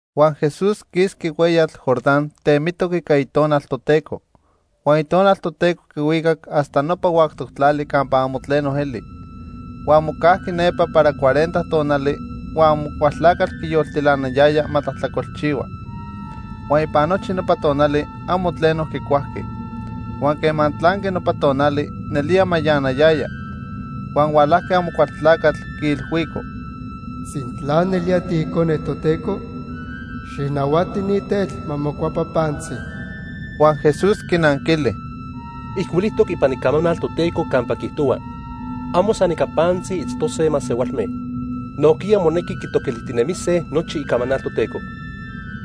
Huan Jesús quisqui hueyatl Jordán temitoc ica Itonal Toteco. Huan Itonal Toteco quihuicac hasta nopa huactoc tlali campa amo tleno eli. Huan mocajqui nepa para cuarenta tonali huan Amocualtlacatl quiyoltilanayaya ma tlajtlacolchihua. Huan ipan nochi nopa tonali amo tleno quicuajqui. Huan quema tlanqui nopa tonali, nelía mayanayaya. Huan hualajqui Amocualtlacatl quiilhuico: —Sintla nelía tiIcone Toteco, xijnahuati ni tetl ma mocuepa pantzi. Huan Jesús quinanquili: —Ijcuilijtoc ipan Icamanal Toteco campa quiijtohua: 'Amo san ica pantzi itztose masehualme. Nojquiya monequi quitoquilijtinemise nochi Icamanal Toteco.'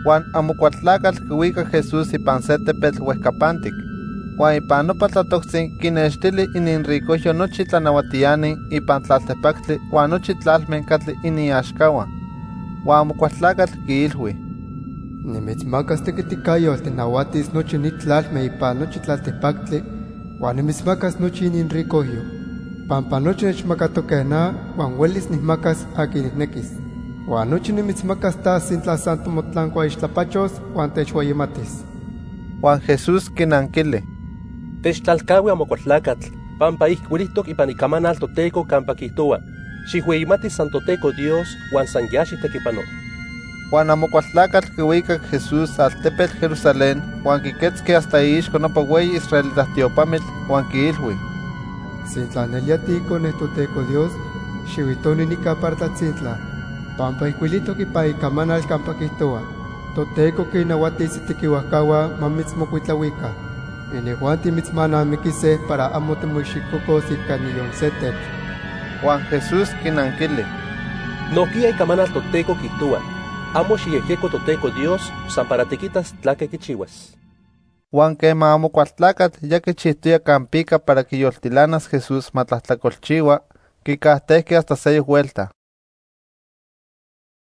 Huan Amocualtlacatl quihuicac Jesús ipan se tepetl huejcapantic. Huan ipan nopa tlatoctzi quinextili ininricojyo nochi tlanahuatiani ipan tlaltipactli huan nochi tlalme catli iniaxcahua. Huan Amocualtlacatl quiilhui: —Nimitzmacas tequiticayotl tijnahuatis nochi ni tlalme ipan nochi tlaltipactli huan nimitzmacas nochi ininricojyo, pampa nochi nechmacatoque na huan huelis nijmacas aqui nijnequis. Huan nochi nimitzmacas ta sintla san timotlancuaixtlapachos huan techhueyimatis. Huan Jesús quinanquili: —Techtlalcahui, Amocualtlacatl, pampa ijcuilijtoc ipan Icamanal Toteco campa quiijtohua: 'Xijhueyimati san Toteco Dios huan san ya xijtequipano.' Huan Amocualtlacatl quihuicac Jesús altepetl Jerusalén huan quiquetzqui hasta iixco nopa hueyi israelita tiopamitl huan quiilhui: —Sintla nelía tiIcone Toteco Dios, xihuitoni nica para tlatzintla, pampa ijcuilijtoc ipan Icamanal campa quiijtohua: 'Toteco quinnahuatis itequihuajcahua ma mitzmocuitlahuica. Inijuanti mitzmanamiquise para amo timoicxicocos ica niyon se tetl.' Huan Jesús quinanquili: —Nojquiya Icamanal Toteco quiijtohua: 'Amo xijyejyeco Toteco Dios san para tiquitas tlaque quichihuas.' Huan quema Amocualtlacatl ya quichijtoya campica para quiyoltilanas Jesús ma tlajtlacolchihua, quicajtejqui hasta seyoc huelta.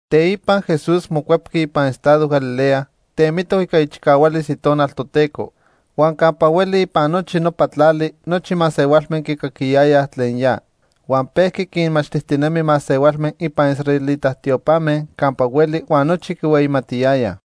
Teipa Jesús mocuepqui ipan estado Galilea temitoc ica ichicahualis Itonal Toteco, huan campa hueli ipan nochi nopa tlali nochi masehualme quicaquiyayaj tlen ya. Huan pejqui quinmachtijtinemi masehualme ipan israelita tiopame campa hueli huan nochi quihueyimatiyayaj.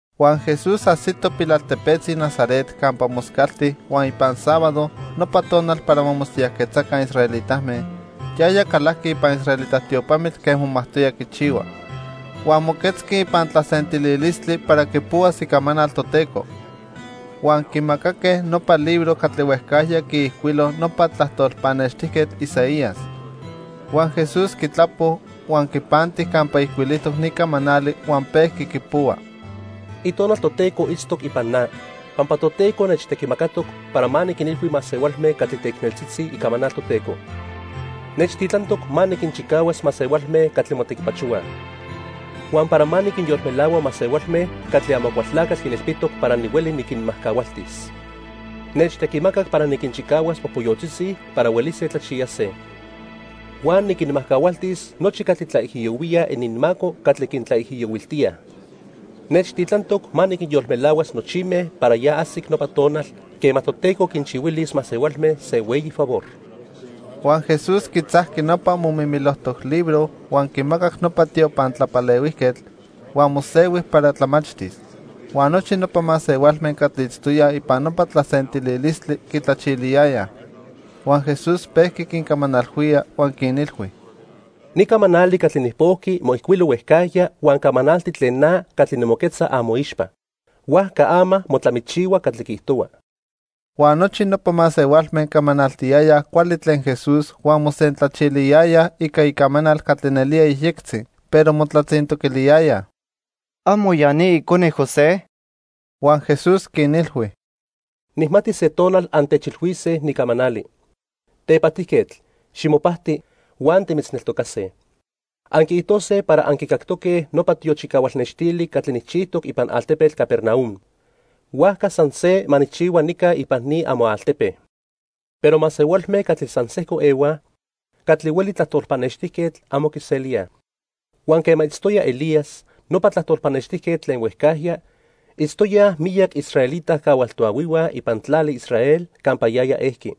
Huan Jesús ajsito pilaltepetzi Nazaret campa moscalti huan ipan sábado, nopa tonal para ma mosiyajquetzaca israelitame, yaya calajqui ipan israelita tiopamitl quen momajtoya quichihua. Huan moquetzqui ipan tlasentililistli para quipohuas Icamanal Toteco. Huan quimacaque nopa libro catli huejcajya quiijcuilo nopa tlajtol pannextijquetl Isaías. Huan Jesús quitlapo, huan quipanti campa ijcuilijtoc ni camanali huan pejqui quipohua: "Itonal Toteco itztoc ipan na, pampa Toteco nechtequimacatoc para ma niquinilhui masehualme catli teicneltzitzi icamanal Toteco. Nechtitlantoc ma niquinchicahuas masehualme catli motequipachohuaj, huan para ma niquinyolmelahua masehualme catli Amocualtlacatl quinilpitoc para nihueli niquinmajcahualtis. Nechtequimacac para niquinchicahuas popoyotzitzi para huelise tlachiyase. Huan niquinmajcahualtis nochi catli tlaijiyohuíaj ininmaco catli quintlaijiyohuiltíaj. Nechtitlantoc ma niquinyolmelahuas nochime para ya ajsic nopa tonal, quema Toteco quinchihuilis masehualme se hueyi favor." Huan Jesús quitzajqui nopa momimilojtoc libro huan quimacac nopa tiopan tlapalehuijquetl, huan mosehui para tlamachtis. Huan nochi nopa masehualme catli itztoyaj ipan nopa tlasentililistli quitlachiliyayaj. Huan Jesús pejqui quincamanalhuía huan quinilhui: —Ni camanali catli nijpojqui moijcuilo huejcajya huan camanalti tlen na catli nimoquetza amoixpa. Huajca ama motlamichihua catli quiijtohua. Huan nochi nopa masehualme camanaltiyayaj cuali tlen Jesús huan mosentlachiliyayaj ica icamanal catli nelía yejyectzi, pero motlatzintoquiliyayaj: —¿Amo ya ni icone José? Huan Jesús quinilhui: —Nijmati se tonal antechilhuisnequij ni camanali: 'Tepajtijquetl, ximopajti, huan timitzneltocase.' Anquiijtose para anquicactoque nopa tiochicahual nextili catli nijchijtoc ipan altepetl Capernaum, huajca san se ma nijchihua nica ipan ni amoaltepe. Pero masehualme catli san sejco ehuaj catli hueli tlajtol pannextijquetl amo quiselíaj. Huan quema itztoya Elías, nopa tlajtol pannextijquetl tlen huejcajya, itztoyaj miyac israelita cahual toahuihua ipan tlali Israel campa yaya ejqui.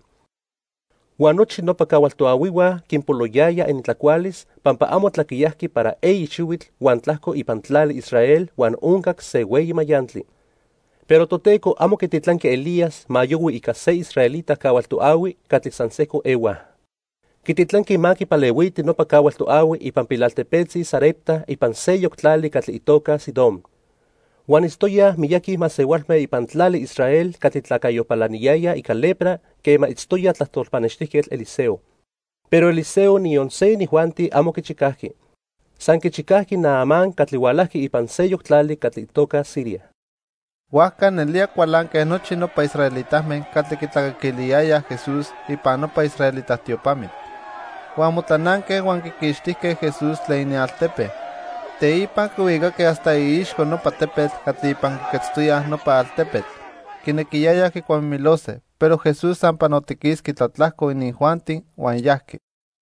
Huan nochi nopa cahual toahuihua quinpoloyaya inintlacualis pampa amo tlaquiyajqui para eyi xihuitl huan tlajco ipan tlali Israel huan oncac se hueyi mayantli. Pero Toteco amo quititlanqui Elías ma yohui ica se israelita cahual toahui catli san sejco ehuaj. Quititlanqui ma quipalehuiti nopa cahual toahui ipan pilaltepetzi Sarepta ipan seyoc tlali catli itoca Sidón. Huan itztoyaj miyaqui masehualme ipan tlali Israel catli tlacayo palaniyayaj ica lepra quema itztoya tlajtol pannextijquetl Eliseo, pero Eliseo niyon se inijuanti amo quichicajqui. San quichicajqui Naamán catli hualajqui ipan seyoc tlali catli itoca Siria. Huajca nelía cualanque nochi nopa israelitame catli quitlacaquiliyayaj Jesús ipan nopa israelita tiopamitl. Huan motlananque huan quiquixtijque Jesús tlen inialtepe. Teipa quihuicaque hasta iixco nopa tepetl catli ipan quiquetztoya nopa altepetl. Quinequiyayaj quicuamimilose, pero Jesús san panotiquisqui tlatlajco inijuanti huan yajqui.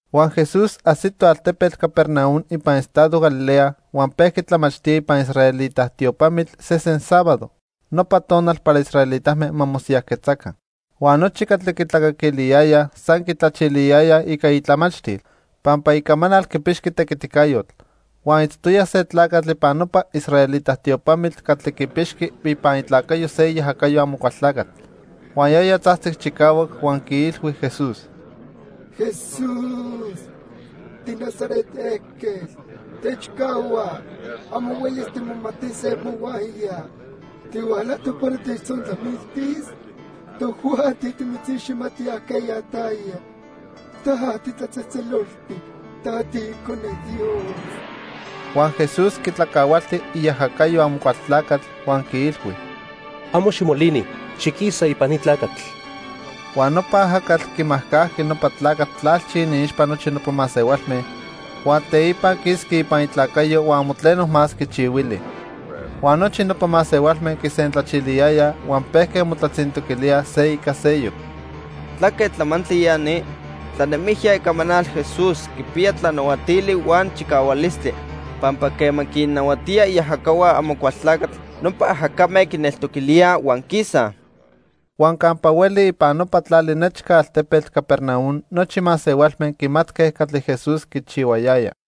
Huan Jesús ajsito altepetl Capernaum ipan estado Galilea huan pejqui tlamachtía ipan israelita tiopamitl sesen sábado, nopa tonal para israelitame ma mosiyajquetzaca. Huan nochi catli quitlacaquiliyayaj san quitlachiliyayaj ica itlamachtil, pampa icamanal quipixqui tequiticayotl. Huan itztoya se tlacatl ipan nopa israelita tiopamitl catli quipixqui ipan itlacayo se iajacayo Amocualtlacatl. Huan yaya tzajtzic chicahuac huan quiilhui Jesús: —Jesús, tiNazaret ejquetl, techcahua. Amo huelis timomatise mohuaya. ¿Tihualajtoc para techtzontlamiltis? Tojuanti timitziximatij ajqueya taya. Ta titlatzejtzeloltic. Ta tiIcone Dios. Huan Jesús quitlacahualti iajacayo Amocualtlacatl huan quiilhui: —Amo ximolini. Xiquisa ipan ni tlacatl. Huan nopa ajacatl quimajcajqui nopa tlacatl tlalchi iniixpa nochi nopa masehualme, huan teipa quisqui ipan itlacayo huan amo tleno más quichihuili. Huan nochi nopa masehualme quisentlachiliyayaj huan pejque motlatzintoquilíaj se ica seyoc: —¿Tlaque tlamantli ya ni? Tlanemijya icamanal Jesús quipiya tlanahuatili huan chicahualistli pampa quema quinnahuatía iajacahua Amocualtlacatl, nopa ajacame quineltoquilíaj huan quisaj. Huan campa hueli ipan nopa tlali nechca altepetl Capernaum nochi masehualme quimatque catli Jesús quichihuayaya.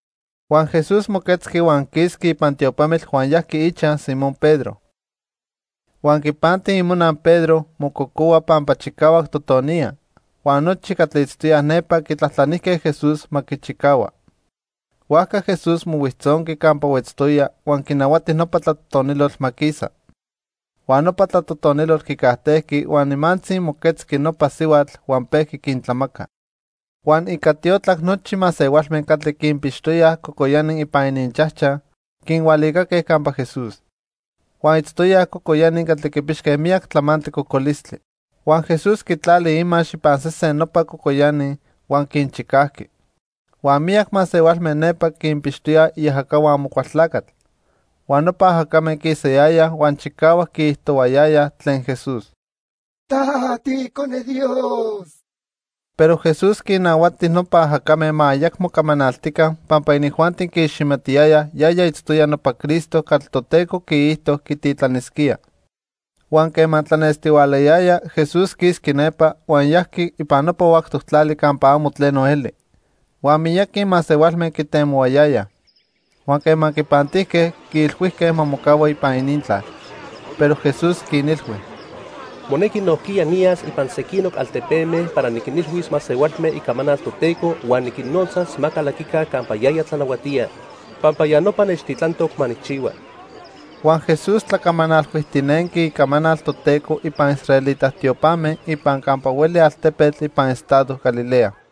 Huan Jesús moquetzqui huan quisqui ipan tiopamitl huan yajqui ichaj Simón Pedro. Huan quipanti imona Pedro mococohua pampa chicahuac totoniya, huan nochi catli itztoyaj nepa quitlajtlanijque Jesús ma quichicahua. Huajca Jesús mohuijtzonqui campa huetztoya huan quinahuati nopa tlatotonilotl ma quisa. Huan nopa tlatotonilotl quicajtejqui, huan nimantzi moquetzqui nopa sihuatl huan pejqui quintlamaca. Huan ica tiotlac nochi masehualme catli quinpixtoyaj cocoyani ipan ininchajchaj quinhualicaque campa Jesús. Huan itztoyaj cocoyani catli quipixque miyac tlamantli cocolistli. Huan Jesús quitlali imax ipan sesen nopa cocoyani huan quinchicajqui. Huan miyac masehualme nepa quinpixtoyaj iajacahua Amocualtlacatl. Huan nopa ajacame quisayayaj huan chicahuac quiijtohuayayaj tlen Jesús: "Ta tiIcone Dios." Pero Jesús quinnahuati nopa ajacame ma ayacmo camanaltica pampa inijuanti quiiximatiyayaj yaya itztoya nopa Cristo catli Toteco quiijto quititlanisquía. Huan quema tlanestihualayaya, Jesús quisqui nepa, huan yajqui ipan nopa huactoc tlali campa amo tleno eli. Huan miyaqui masehualme quitemohuayayaj. Huan quema quipantijque, quiilhuijque ma mocahua ipan inintlal. Pero Jesús quinilhui: —Monequi nojquiya niyas ipan sequinoc altepeme para niquinilhuis masehualme icamanal Toteco huan niquinnotzas ma calaquica campa yaya tlanahuatía, pampa ya nopa nechtitlantoc ma nijchihua. Huan Jesús tlacamanalhuijtinenqui icamanal Toteco ipan israelita tiopame ipan campa hueli altepetl ipan estado Galilea.